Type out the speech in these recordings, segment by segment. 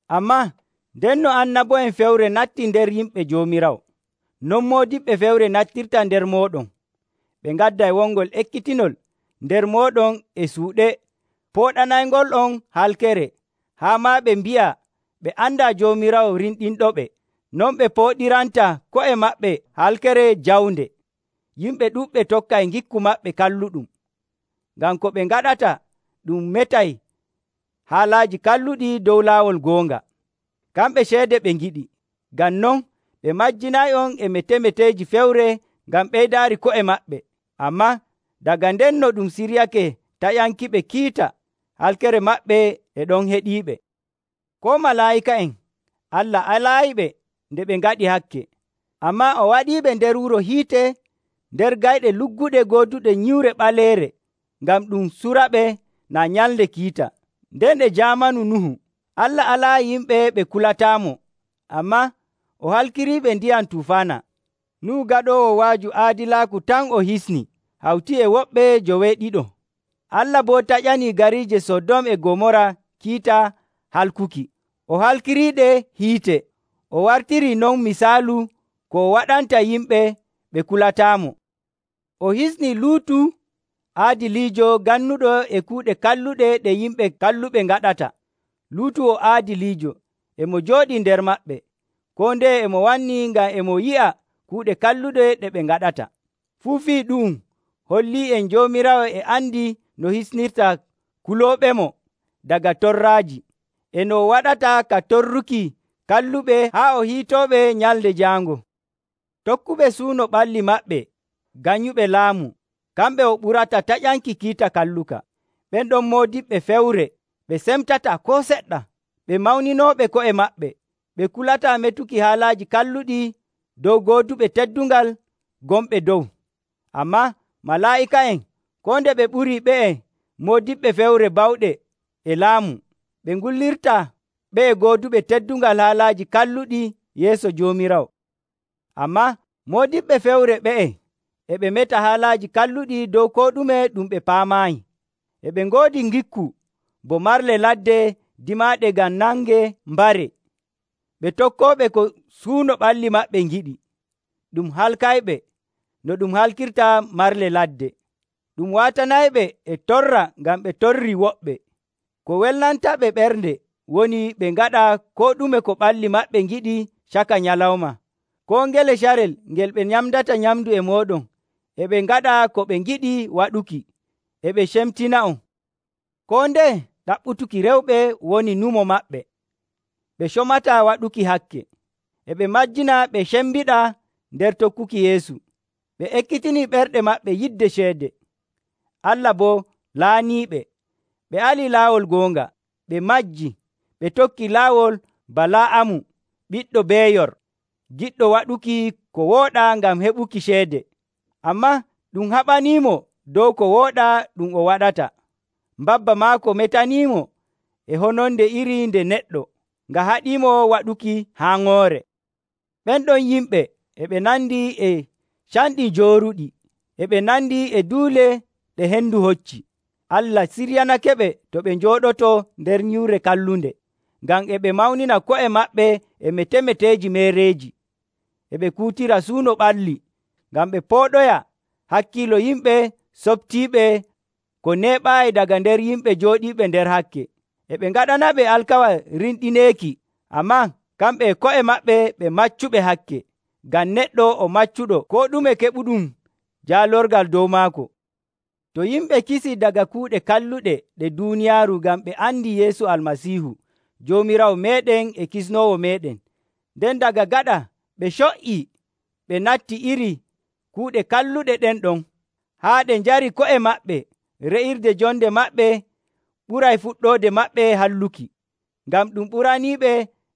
Ammaa ndenno annabo'en fewre nattii nder yimɓe Joomiraawo. Non moodiɓɓe fewre nattirta nder mooɗon. Ɓe ngadday wongol ekkitinol nder mooɗon e suuɗe pooɗanayngol'on halkere, haa maa ɓe mbi'a ɓe andaa Joomiraawo rimɗinɗoɓe. Non ɓe pooɗiranta ko'e maɓɓe halkere jawnde. Yimɓe ɗuɗɓe tokkay ngikku maɓɓe kalluɗum. Ngam ko ɓe ngaɗata ɗum metay haalaaji kalluɗi dow laawol goonga. Kamɓe ceede ɓe ngiɗi. Ngam non ɓe majjinay'on e metemeteeji fewre ngam ɓeydaari ko'e maɓɓe. Ammaa daga ndenno ɗum siryake taƴankiɓe kiita, halkere maɓɓe e ɗon heɗiiɓe. Koo malaa'ika'en, Allah alaayiɓe nde ɓe ngaɗi hakke, ammaa o waɗiɓe nder wuro hiite nder gayɗe lugguɗe gooduɗe nyiwre ɓaleere ngam ɗum suraɓe naa Nyalnde Kiita. Nden e jaamanu Nuhu, Allah alaayi yimɓe ɓe kulataamo, ammaa o halkiriɓe ndiyam tufaana. Nuhu gaɗoowo wa'aju aadilaaku tan o hisni hawti e woɓɓe njoweeɗiɗo. Allah boo taƴanii gariije Sodom e Gomoora kiita halkuki. O halkiriiɗe hiite, o wartirii non misaalu ko o waɗanta yimɓe ɓe kulataamo. O hisnii Luutu aadiliijo gannuɗo e kuuɗe kalluɗe ɗe yimɓe kalluɓe ngaɗata. Luutu o aadiliijo, e mo jooɗii nder maɓɓe. Koo ndeye e mo wanni ngam e mo yi'a kuuɗe kalluɗe ɗe ɓe ngaɗata. Fuu fii ɗu'um hollii'en Joomiraawo e andi no hisnirta kulooɓemo daga torraaji, e no o waɗata ka torrirki kalluɓe haa o hiitooɓe Nyalnde Jaango. Tokkuɓe suuno ɓalli maɓɓe nganyuɓe laamu, kamɓe o ɓurata taƴanki kiita kalluka. Ɓen ɗon moodiɓɓe fewre ɓe cemtataa koo seɗɗa, ɓe mawninooɓe ko'e maɓɓe. Ɓe kulataa metuki haalaaji kalluɗi dow gooduɓe teddungal gonɓe dow. Ammaa malaa'ika'en, koo nde ɓe ɓurii ɓe'e moodiɓɓe fewre bawɗe e laamu, ɓe ngullirtaa ɓe'e gooduɓe teddungal haalaaji kalluɗi yeeso Joomiraawo. Ammaa moodiɓɓe fewre ɓe'e e ɓe meta haalaaji kalluɗi dow koo ɗume ɗum ɓe paamaayi. E ɓe ngoodi ngikku bo marle ladde dimaaɗe ngam nangee mbaree. Ɓe tokkooɓe ko suuno ɓalli maɓɓe ngiɗi. Ɗum halkayɓe no ɗum halkirta marle ladde. Ɗum waatanayɓe e torra ngam ɓe torrii woɓɓe. Ko welnantaɓe ɓernde woni ɓe ngaɗa koo ɗume ko ɓalli maɓɓe ngiɗi caka nyalawma. Koo ngele carel ngel ɓe nyamdata nyamndu e mooɗon e ɓe ngaɗa ko ɓe ngiɗi waɗuki, e ɓe cemtina'on. Koo ndeye ɗaɓɓutuki rewɓe woni nyumo maɓɓe. Ɓe comataa waɗuki hakke. E ɓe majjina ɓe cembiɗaa nder tokkuki Yeesu. Ɓe ekkitini ɓerɗe maɓɓe yidde ceede. Allah boo laaniiɓe. Ɓe alii laawol goonga, ɓe majjii, ɓe tokkii laawol Bala'amu, ɓiɗɗo Beeyor, giɗɗo waɗuki ko wooɗaa ngam heɓuki ceede. Ammaa ɗum haɓaniimo dow ko wooɗaa ɗum o waɗata. Mbabba maako metaniimo e hononde iri nde neɗɗo, nga haɗimo waɗuki haaŋoore. Ɓen ɗon yimɓe e ɓe nandi e canɗi jooruɗi, e ɓe nandi e duule ɗe hendu hocci. Allah siryanakeɓe to ɓe njooɗotoo nder nyiwre kallunde, ngam e ɓe mawnina ko'e maɓɓe e metemeteeji meereeji. E ɓe kuutira suuno ɓalli ngam ɓe pooɗoya hakkiilo yimɓe soɓtiiɓe ko neeɓaayi daga nder yimɓe jooɗiiɓe nder hakke. E ɓe ngaɗanaɓe alkawal rimɗineeki, ammaa kamɓe e ko'e maɓɓe ɓe maccuɓe hakke, ngam neɗɗo o maccuɗo koo ɗume keɓuɗum jaalorgal dow maako. To yimɓe kisii daga kuuɗe kalluɗe ɗe duuniyaaru ngam ɓe andii Yeesu Almasiihu Joomiraawo meeɗen e Kisnoowo meeɗen, nden daga gaɗa ɓe co''ii ɓe natti iri kuuɗe kalluɗe ɗen ɗon, haa ɗe njarii ko'e maɓɓe, re'irde jonde maɓɓe ɓuray fuɗɗoode maɓɓe halluki. Ngam ɗum ɓuraniiɓe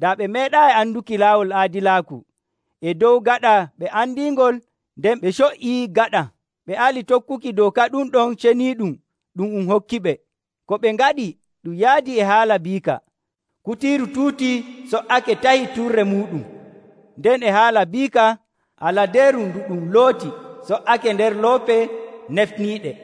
daa ɓe meeɗaayi anduki laawol aadilaaku e dow gaɗa ɓe andiingol nden ɓe co''ii gaɗa, ɓe ali tokkuki dooka ɗum ɗon ceniiɗum ɗum um hokkiɓe. Ko ɓe ngaɗi ɗum yaadii e haala biika, “Kutiiru tuutii so''ake tahi turre muuɗum,” nden e haala biika, “Aladeeru ndu ɗum looti so''ake nder loope nefniiɗe.”